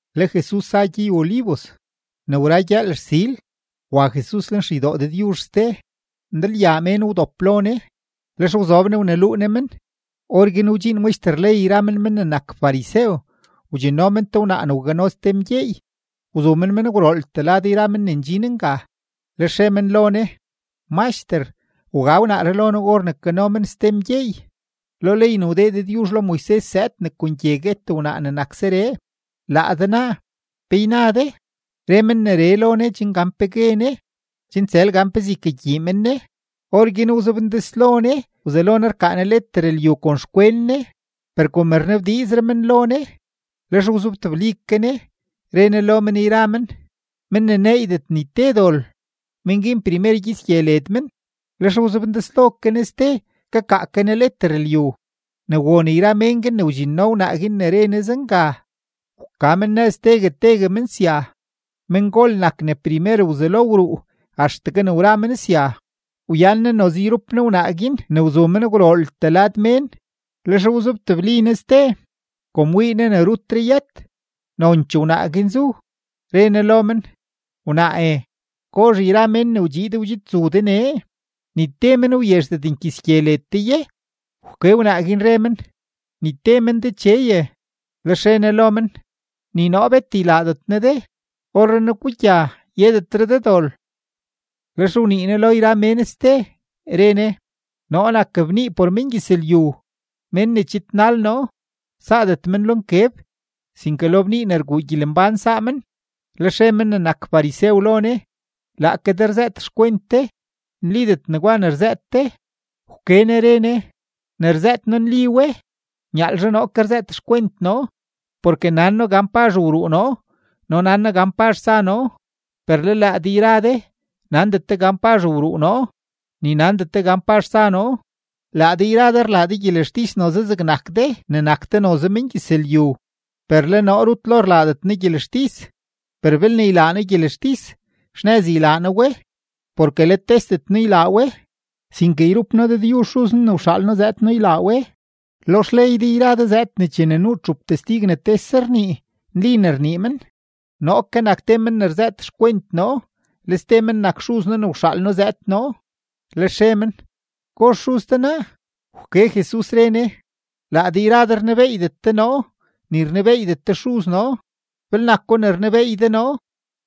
Le Jesus za gyey-Olivos. Ne wra gyëël rsil, wa Jesus lenxeydoo Dëdyuzh ste. Ndalyaa mén wdop lo Ne, lex wzob Ne wneluu Ne men. Orguin wdxiin maxter ley yra men men ne nak farisew, wdxinno men te wnaa ne wgano ste mgyeey, wzu men men gwrooltee lad yra men ne ndxin nga, lex re men lo Ne: ―Maxter, wga wnaaree lo noo or ne kano men ste mgyeey. Lo ley ne wdee Dëdyuzh lo Moises zëëd ne kon gye guet wnaa ne nak zeree. Laa de naa, ¿pe yna de? Re men neree lo Ne chen gan pe gue Ne, chen tsël gan pezee ykagyii men Ne. Orguin wzobndeslo Ne wzelo Ne rkaa Ne leter lyu kon xkwen Ne. Per kom rnabdiizre men lo Ne, lex wzobtebli ke Ne re Ne lo men yra men: ―Men ne neeydet ni te dol, men guin primer kyits gye led men. Lex wzobndeslo ke Ne ste kakaa ke Ne leter lyu. Ne won yra men guin ne wdxinno wnaa guin ne re Ne zenga, wka men nëz tegue tegue men sya, mengol nak ne primer wzelo wruu axtegue ne wra men sya; wyan Ne noze yrup Ne wnaa guin ne wzu men gwrooltee lad mén. Lex wzobtebli Ne ste. Kom wii Ne ne rutre yët, nonchee wnaa guin zu, re Ne lo men: ―Wnaae, ¿gozh yra mén ne wdxiid wdxidzu de nee? ¿Ni te men wyezhdet nkyits gye led de ye? Wke wnaa guin, re men: ―Ni te men Decheye. Lex re Ne lo men: ―Ni noo bet ylaadet noo de. Orrenaa gugya, yedetre de dol. Lex wnii Jesus lo yra mén ste, re Ne: ―Noo nak bnii por mengyëzlyu; men ne chidnal noo, saadet men lo nkeb, sinke lo bnii ne rguu gyelembán saa men. Lex re men ne nak farisew lo Ne: ―Laake de rzëët xkwent de; nlidet negwa ne rzëët de. Wke Ne re Ne: ―Ne rzëët noo nli we, nyaalzhe noo ke rzëët xkwent noo. Porke nan noo gan pazh wruu noo no nan noo gan pazh tsa noo; per le laa de yra de nandet de gan pazh wruu noo, ni nandet de gan pazh tsa noo. Laa de yra de rlaa de gyelextis noze zegne nak de ne nak de noze mengyëzlyu, per le noo rut lo rlaadet noo gyelextis. Per belne ylaa noo gyelextis, xnëz ylaa noo we, porke let tesdet noo ylaa we, sinke yrup noo Dëdyuzh Xuz noo ne wxaal noo zëëd noo ylaa we. Lo xley de yra de zëëd ne chene nuu txup testig ne tese rnii, nli ne rnii men. Noo ke nak te men ne rzëët xkwent noo, le ste men nak Xuz noo ne wxaal noo zëëd noo. Lex re men: ―¿Gozh xuz de naa? Wke Jesus, re Ne: ―Laa de yra de rnebeeydet de noo, ni rnebeeydet de Xuz noo; belne nako ne rnebeey de noo,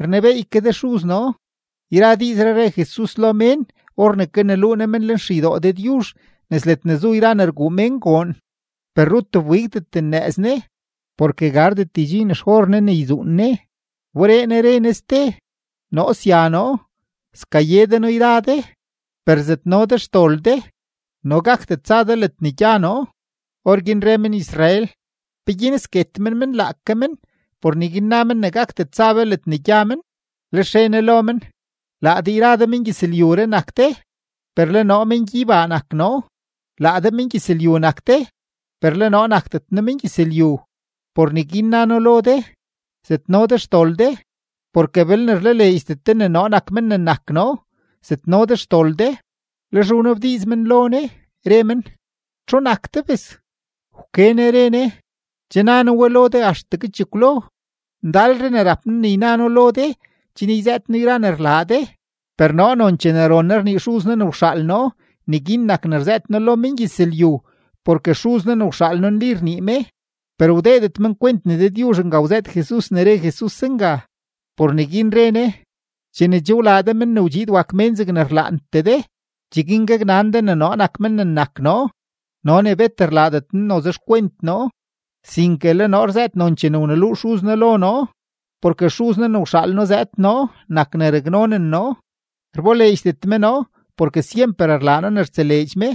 rnebeey ke de Xuz noo. Yra diizree re Jesus lo mén or ne kaneluu Ne men lenxeydoo Dëdyuzh nes ledne zu yra ne rguu mén goon. Per rut wbigdet nnëëz Ne, porke gardet ydxiin xor Ne ne yzuun Ne. Wberee Jesus re Ne ste: ―Noo sya noo, skaye de noo yra de, per zetno de xdol de, no gakdet tsa de ledne gya noo. Orguin re men-Israel: ―¿Peguin sket men men laake men, por neguin na men ne gakdet tsa be ledne gya men? Lex re Ne lo men: ―Laa de yra de mengyëzlyuree nak de, per le noo mengyeybaa nak noo; laa de mengyëzlyu nak de, per le noo nakdet noo mengyëzlyu. Por neguin na noo lo de: “Zetno de xdol de.” Porke belne rlaleedxdet de ne noo nak men ne nak noo, zetno de xdol de. Lex wnabdiiz men lo Ne, re men: ―¿Txu nak de, bes? Wke Ne re Ne: ―Che na noo we lo de axtegue chekwlo. Ndalre ne rap noo ne yna noo lo de chen yzëët noo yra ne rlaa de, per noo nonchee ne ron noo rnii Xuz noo ne wxaal noo, neguin nak ne rzëët noo lo mengyëzlyu porke Xuz noo ne wxaal noo nli rnii me. Per wdeedet men kwent ne Dëdyuzh nga wzëët Jesus ne re Jesus zenga. Por neguin re Ne: ―Chene che wlaa de Men ne wdxiid wak Mén zegne rlaantee de, cheguin gaknan de ne noo nak men ne nak noo no ne bet rlaadet noo noze xkwent noo, sinke le noo rzëët nonchee ne wneluu Xuz noo lo noo. Porke Xuz noo ne wxaal noo zëëd noo nak ne raknonen noo; rboleedxdet me noo porke syemper rlaa noo ne rtseleedx me.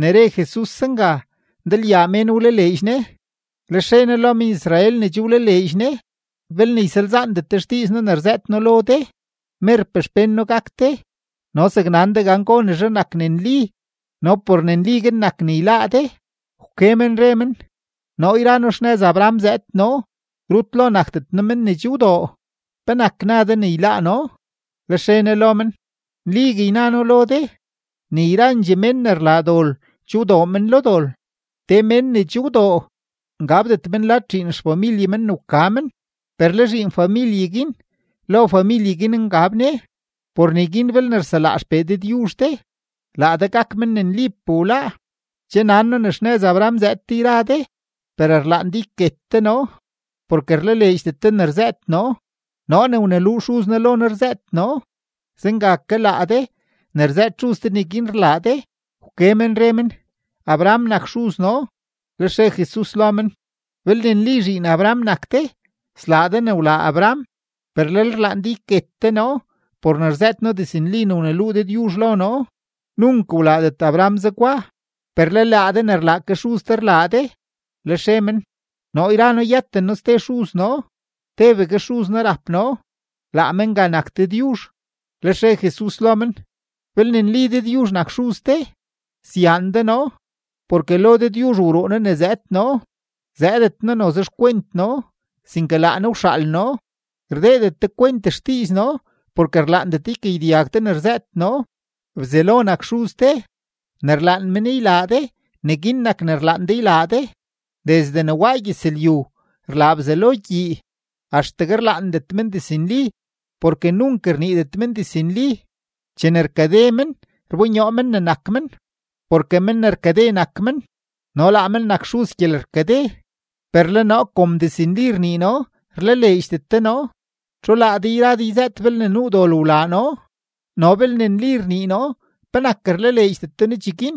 Ne re Jesus zenga, ndalyaa mén wlaleedx Ne. Lex re Jesus lo men-Israel ne che wlaleedx Ne: ―Belne ysalzaandet de xdiiz noo ne rzëët noo lo de, merpee xpén noo gak de, no zaknan de gonezhe nak ne nli no por ne nli guin nak ne yláá de. Wke men re men: ―Noo yra noo xnëz Abraham zëëd noo, rut lo nakdet noo mén ne che wdoo. ¿Penak na de ne yláá noo? Lex re Ne lo men: ―Nligue yna noo lo de, ne yrandxee mén ne rlaa dol che wdoo men lo dol. Te mén ne che wdoo ngabdet men lad zhiin familye ne wka men, per le zhiin familye guin lo familye guin ngab ne. Por neguin belne rselaa XPee Dëdyuzh de, laa de gak men ne nlipee wláá. Che nan noo ne xnëz Abraham zëëd de yra de, per rlaan de yket de noo, porke rlaleedxdet de ne rzëët noo. Noo ne wneluu Xuz noo lo noo rzëët noo, zenga ke laa de ne rzëët xuz de neguin rlaa de. Wke men re men: ―Abraham nak xuz noo. Lex re Jesus lo men: ―Belne nli zhiin Abraham nak de, slaa de ne wlaa Abraham. Per lel rlaan de yket de noo por ne rzëët noo diznli ne wneluu Dëdyuzh lo noo. ¡Nunk wlaadet Abraham zegwa! Per le laa de ne rlaa ke xuz de rlaa de. Lex re men: ―Noo yra noo yëten noo ste xuz noo; tebegue xuz noo rap noo, laa me nga nak Dëdyuzh. Lex re Jesus lo men: ―Belne nli Dëdyuzh nak xuz de, syaan de noo, porke lo Dëdyuzh wruu noo ne zëëd noo; zëëdet noo noze xkwent noo, sinke laa Ne wxaal noo. Rdeedet de kwent xdiiz noo porke rlaandet de ykagyedyag de ne rzëët noo. Bzelo nak xuz de, ne rlaan men ylaa de, neguin nak ne rlaan de ylaa de. Desde ne waa gyëzlyu rlaa Bzelo gyii. Axtegue rlaandet men diznli, porke nunk rniidet men diznli. Chene rkade men, rbonyoo men ne nak men; porke men ne rkade nak men no laa men nak xuz gyelerkade. Per le noo kom diznli rnii noo, rlaleedxdet de noo. ¿Txu laa de yra de yzëët belne nuu dol wlaa noo? No belne nli rnii noo, ¿penak rlaleedxdet de noo cheguin?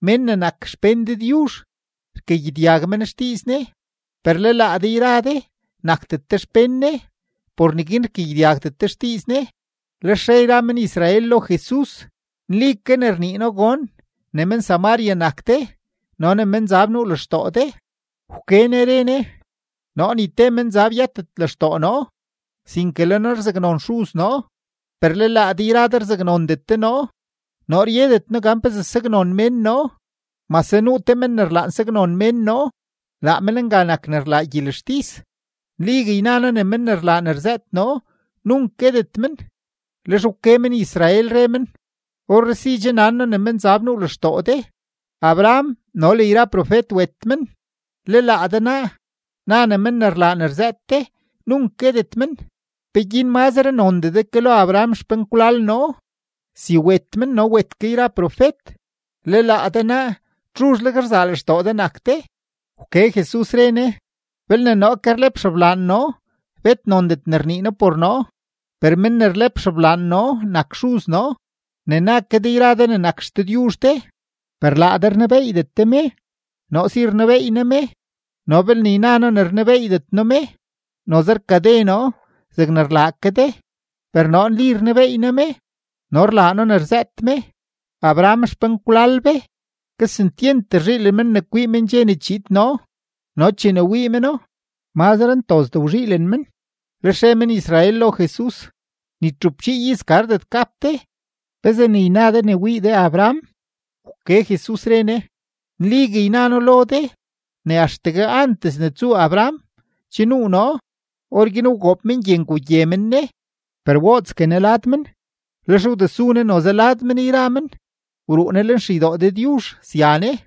Mén ne nak xpén Dëdyuzh, rkagyedyag men xdiiz Ne. Per le laa de yra de nakdet de xpén Ne, por neguin rkagyedyagdet de xdiiz Ne. Lex re yra men-Israel lo Jesus: ―Nli ke rnii noo gon ne men-Samaria nak de no ne menzab nuu lextoo de. Wke Ne re Ne: ―Noo ni te menzab yëtet lextoo noo, sinke le noo rzaknon Xuz noo, per le laa de yra de rzaknondet de noo. Noo ryedet noo gan pezee saknon mén noo, mase nuu te Men ne rlaan ne saknon mén noo, laa Men nga nak ne rlaa gyelextis. Nligue yna noo ne men ne rlaa ne rzëët noo, nunk guetet men. Lex wke men-Israel, re men: ―Orree si che nan noo ne menzab nuu lextoo de. Abraham no le yra profet wet men, le laa de naa, na ne men ne rlaa ne rzëët de, nunk guetet men. ¿Peguin mazre nondee de ke lo Abraham xpenkwlal noo? Si wet men no wet ke yra profet. Le laa de naa, ¿txuzhleg rzaa lextoo de nak de? Wke Jesus, re Ne: ―Belne noo ke rlep xeblaan noo, bet nondet ne rnii noo por noo. Per men ne rlep xeblaan noo nak Xuz noo, ne na ke de yra de ne nak XDëdyuzh de. Per laa de rnebeeydet de me. Noo si rnebeey noo me, no belne yna noo ne rnebeeydet noo me, noze rkade noo zeg rlaa ke de. Per noo nli rnebeey noo me, no rlaa noo ne rzëët me. Abraham xpenkwlal be, kesentyent rzhiilen men ne kwii men dxe ne chiid noo, no chene wii meno, mazre ntozdee wzhiilen men. Lex re men-Israel lo Jesus: ―Ni txupchii iz gardet gap de, ¿pezee ne yna de ne wii de Abraham? Wke Jesus, re Ne: ―Nligue yna noo lo de ne axtegue antes ne tsuu Abraham, che nuu noo. Orguin wgoob men gye ngugye men Ne; per wootsgue Ne lad men, lex wdesu Ne noze lad men yra men, wruu Ne lenxeydoo Dëdyuzh sya Ne.